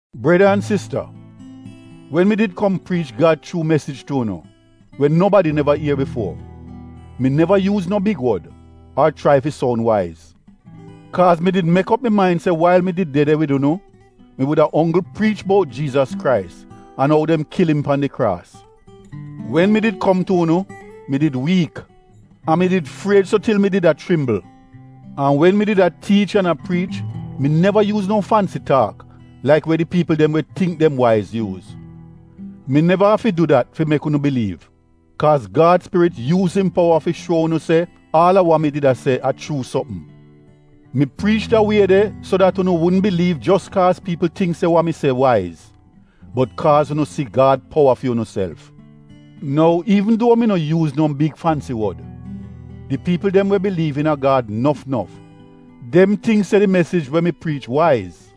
Breda an sista, wen mi did kom priich Gad chuu mesij tu unu, we nobadi neva ier bifuo, mi neva yuuz no big wod ar chrai fi soun waiz. Kaaz mi did mek op mi main se wail mi did de de wid unu, mi wuda onggl priich bout Jiizas Krais an ou dem kil im pan di kraas. Wen mi did kom tu unu, mi did wiik, an mi did fried so til mi did a chrimbl. An wen mi did a tiich an a priich mi neva yuuz no fansi taak laik we di piipl dem we tingk dem waiz yuuz. Mi neva afi du dat fi mek unu biliiv kaaz Gad Spirit yuuz im powa fi shuo unu se aal a wa mi did a se a chuu sopm. Mi priich da wie de so dat unu wudn biliiv jos kaaz piipl tingk se wa mi se waiz, bot kaaz unu si Gad powa fi unuself. Nou iivn duo mi no yuuz no big fansi wod, di piipl dem we biliiv iina Gad nof nof, dem tingk se di mesij we mi priich waiz.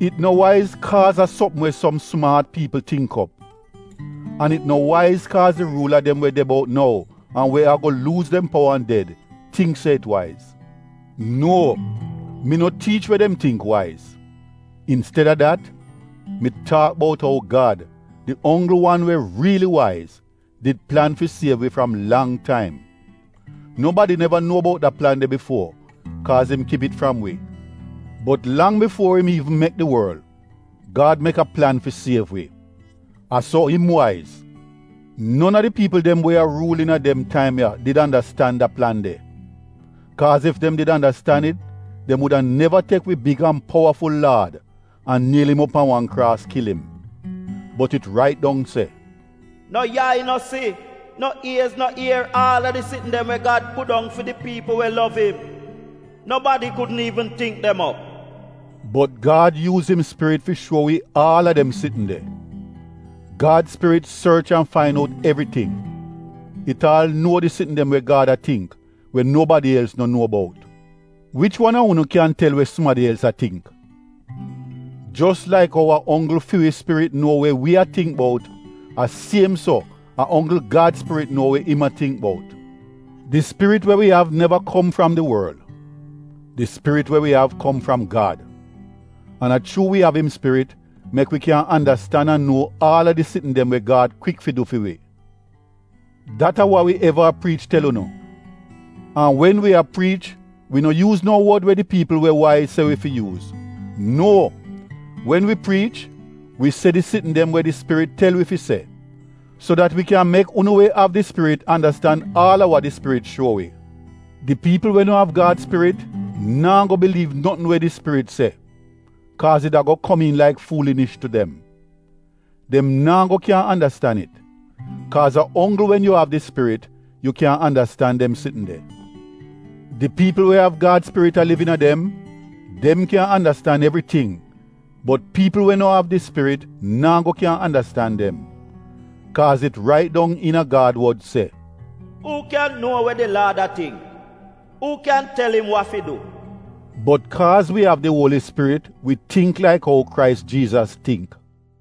It no waiz kaaz a sopm we som sumaat piipl tingk op. An it no waiz kaaz di ruula dem we de bout nou an we ago luuz dem powa an ded, tingk se it waiz. Nuo, mi no tiich we dem tingk waiz. Insteda dat mi taak bout ou Gad, di onggl wan we riili waiz, did plan fi siev wi fram lang taim. Nobadi neva nuo bout da plan de bifuo kaaz im kip it fram wi. Bot lang bifuo im iivn mek di worl, Gad mek a plan fi siev wi — a so im waiz. Non a di piipl dem we a ruul iina dem taim ya did andastan da plan de. Kaaz ef dem did andastan it dem wuda neva tek wi big an powaful Laad, an niel im op pan wan kraas kil im. Bot it rait dong se: “No yai no si, no iez no ier, aal a di sitn dem we Gad pudong fi di piipl we lov im. Nobadi kudn iivn tingk dem op.” Bot Gad yuuz im spirit fi shuo wi aal a dem sitn de. Gad Spirit sorch an fain out evriting, it aal nuo di sitn dem we Gad a tingk we nobadi els no nuo bout. Wich wan a unu kyan tel we sumadi els a tingk? Jos laik ou a onggl fi wi spirit nuo we wi a tingk bout, a siem so a onggl Gad spirit nuo we im a tingk bout. Di spirit we wi av neva kom fram di worl. Di spirit we wi av kom fram Gad, an a chuu wi av im Spirit mek wi kyan andastan an nuo aal a di sitn dem we Gad kwik fi du fi wi. Dat a wa wi eva a priich tel unu. An wen wi a priich wi no yuuz no wod we di piipl we waiz se wi fi yuuz. Nuo, wen wi priich wi se di sitn dem we di Spirit tel wi fi se, so dat wi kyan mek unu we av di Spirit andastan aal a wa di Spirit shuo wi. Di piipl we no av Gad spirit, naa go biliiv notn we di Spirit se kaaz it ago komiin laik fuulinish tu dem. Dem naa go kyan andastan it, kaaz a onggl wen yu av di Spirit yu kyan andastan dem sitn de. Di piipl we av Gad Spirit a liv iina dem, dem kyan andastan evriting bot piipl we no av di Spirit naa go kyan andastan dem. Kaaz it rait dong iina Gad wod se, “Uu kyan nuo we di Laad a tingk? Uu kyan tel im wa fi du?” Bot kaaz wi av di Uoli Spirit wi tingk laik ou Krais Jiizas tingk.